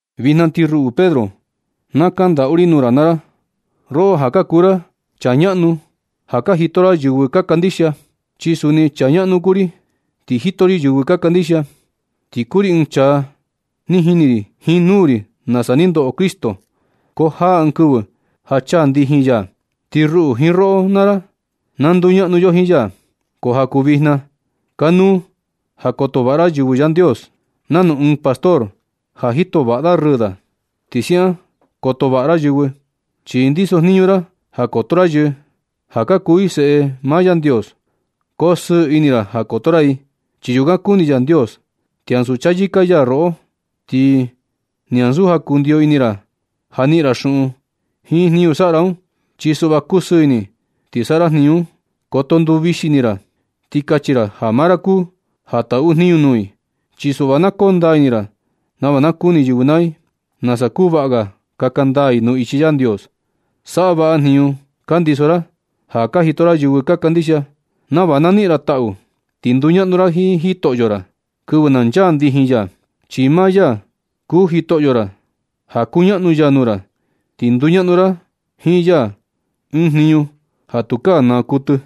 Vijna ti ruꞌu Pedro, na kandaꞌu ri nuu ra naa ra, roꞌo ja ka kuu ra chaa ñaꞌnu ja ka jito ra yɨvɨ ka kandixia, chi suni chaa ñaꞌnu kuu ri, ti jito ri yɨvɨ ka kandixia. Ti kuu ri ɨɨn chaa ni jini ri jiin nuu ri nasa ni ndoꞌo Cristo. Ko jaa ɨɨn kɨvɨ ja chaa ndijin ya, ti ruꞌu jiin roꞌo naa ra na nduñaꞌnu yo jiin ya. Ko ja kuu vijna, kanuu ja koto vaꞌa ra yɨvɨ Yandios. Nanu ɨɨn pastor ja jito vaꞌa da rɨɨ da, ti siaꞌan koto vaꞌa ra yɨvɨ, chi ndiso jniñu ra ja koto ra yɨ ja ka kuu i seꞌe maa Yandios. Ko sɨɨ ini ra ja koto ra i, chi yukan kuni Yandios. Ti ansu chayɨka ya roꞌo, ti ni ansu ja kundiyo ini ra ja niꞌin ra xuꞌun jiin jniñu saꞌa ra un. Chi suꞌva kusɨɨ ini, ti saꞌa ra jniñu un. Koto nduvixi ini ra, ti kachi ra ja maa ra kuu ja taꞌu jniñu nuu i, chi suꞌva na koo ndaa ini ra nava na kuni yɨvɨ naa i nasa kuu vaꞌa ga kaka ndaa i nuu ichi Yandios. Saꞌa vaꞌa jniñu ka ndiso ra ja ka jito ra yɨvɨ ka kandixia, nava na niꞌin ra taꞌu, ti nduñaꞌnu ra jiin jitoꞌo ra kɨvɨ na nchaa ndijin ya, chi maa ya kuu jitoꞌo ra ja kuñaꞌnu ya nuu ra. Ti nduñaꞌnu ra jiin ya ɨɨn jniñu ja tukaa naa kuɨtɨ.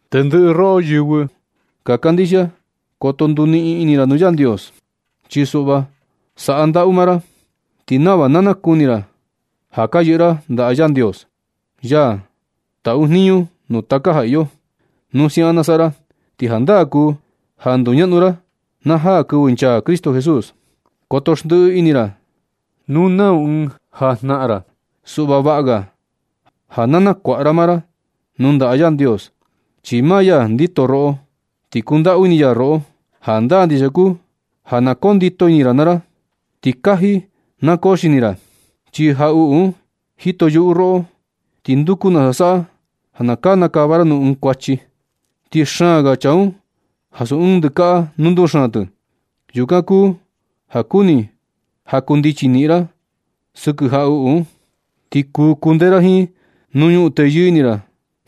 Tendɨꞌɨ roꞌo yɨvɨ ka kandixia, koto nduniꞌin ini ra nuu Yandios, chi suꞌva saꞌa ndaꞌu maa ra, ti nava na nakuni ra ja ka yɨꞌɨ ra ndaꞌa Yandios, ya taꞌu jniñu nuu taka ja iyo. Nu siaꞌan na saꞌa ra, ti jandaa kuu ja nduñaꞌnu ra na jaa kɨvɨ nchaa Cristo Jesús. Koto xndiꞌi ini ra nu nau ɨɨn ja ka jnaꞌan ra, suꞌva vaꞌa ga ja na nakuaꞌa ra maa ra nuu ndaꞌa Yandios, chi maa ya ndito roꞌo, chi kundaꞌu ini ya roꞌo. Jandaa ndixia kuu ja na koo ndito ini ra naa ra ti kaji na koo xini ra, chi jaꞌuꞌu un jito yuꞌu roꞌo ti nduku nasa saꞌa ja kanakava ra nuu ɨɨn kuachi. Ti xaan ga chaa un ansu ɨɨn ndɨkaꞌa nu nduxaan tɨ. Yukan kuu ja kuni ja kundichi niꞌin ra sɨkɨ jaꞌuꞌu un, ti kuu kundee ra jiin nu ñuꞌun teyɨɨ ini ra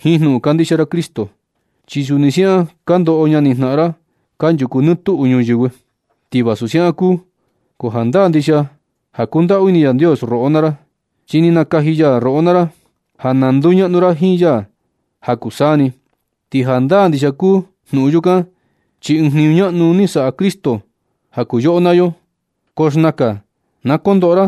jiin jnuꞌun kandixia ra Cristo. Chi suni siaꞌan ka ndoꞌo ñani jnaꞌan ra kanchuku nɨ tuꞌu nuyɨvɨ. Ti vasu siaꞌan kuu, ko jandaa ndixia ja kundaꞌu ini Yandios roꞌo naa ra, chi ni nakaji ya roꞌo naa ra ja na nduñaꞌnu ra jiin ya ja kuu saa ni. Ti jandaa ndixia kuu jnuꞌun yukan, chi ɨɨn jniñu ñaꞌnu ni saꞌa Cristo ja kuu yoꞌo naa yo. Ko xnakan na kondoꞌo ra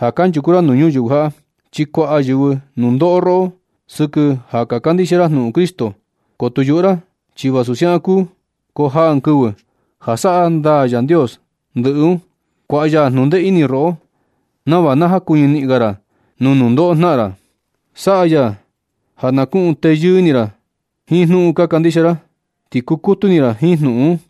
ja kanchuku ra nuu nuyɨvɨ jaꞌa, chi kuaꞌa yɨvɨ nundoꞌo roꞌo sɨkɨ ja ka kandixia ra jnuꞌun Cristo, ko tu yuꞌu ra. Ti vasu siaꞌan kuu, ko jaa ɨɨn kɨvɨ ja saꞌa ndaa Yandios ndɨꞌɨ un. Kuaꞌa ya jnundee ini roꞌo nava na jakuɨñɨ niꞌin ga ra nuu nundoꞌo jnaꞌan ra. Saꞌa ya ja na kuꞌun teyɨɨ ini ra jiin jnuꞌun ka kandixia ra, ti kukutu ini ra jiin jnuꞌun un.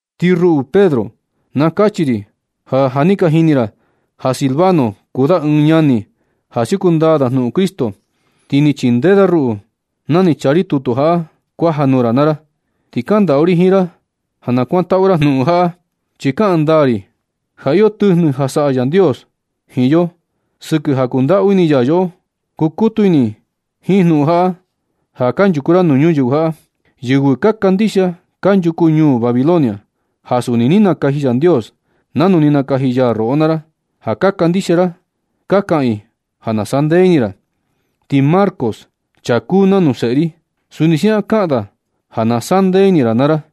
Ti ruꞌu Pedro, na kachi ri ja, ja ka jini ra ja Silvano kuu da ɨɨn ñani ja siuku ndaa da nuu Cristo. Ti ni chindee da ruꞌu na ni chaa ri tutu jaꞌa kuaja nuu ra naa ra. Ti kandaꞌu ri jiin ra ja na kuantaꞌu ra jnuꞌun jaꞌa, chi kaꞌan ndaa ri ja iyo tɨjnɨ ja saꞌa Yandios jiin yo sɨkɨ ja kundaꞌu ini ya yoꞌo. Kukutu ini jiin jnuꞌun jaꞌa ja kanchuku ra nuu ñuyɨvɨ jaꞌa. Yɨvɨ ka kandixia kanchuku ñuu Babilonia, ja suni ni nakaji Yandios nanu ni nakaji ya roꞌo naa ra, ja ka kandixia ra, ka kaꞌan i ja na sandee ini ra. Ti Marcos, chaa kuu nanu seꞌe ri, suni siaꞌan kaꞌan da ja na saꞌa ndee ini ra naa ra.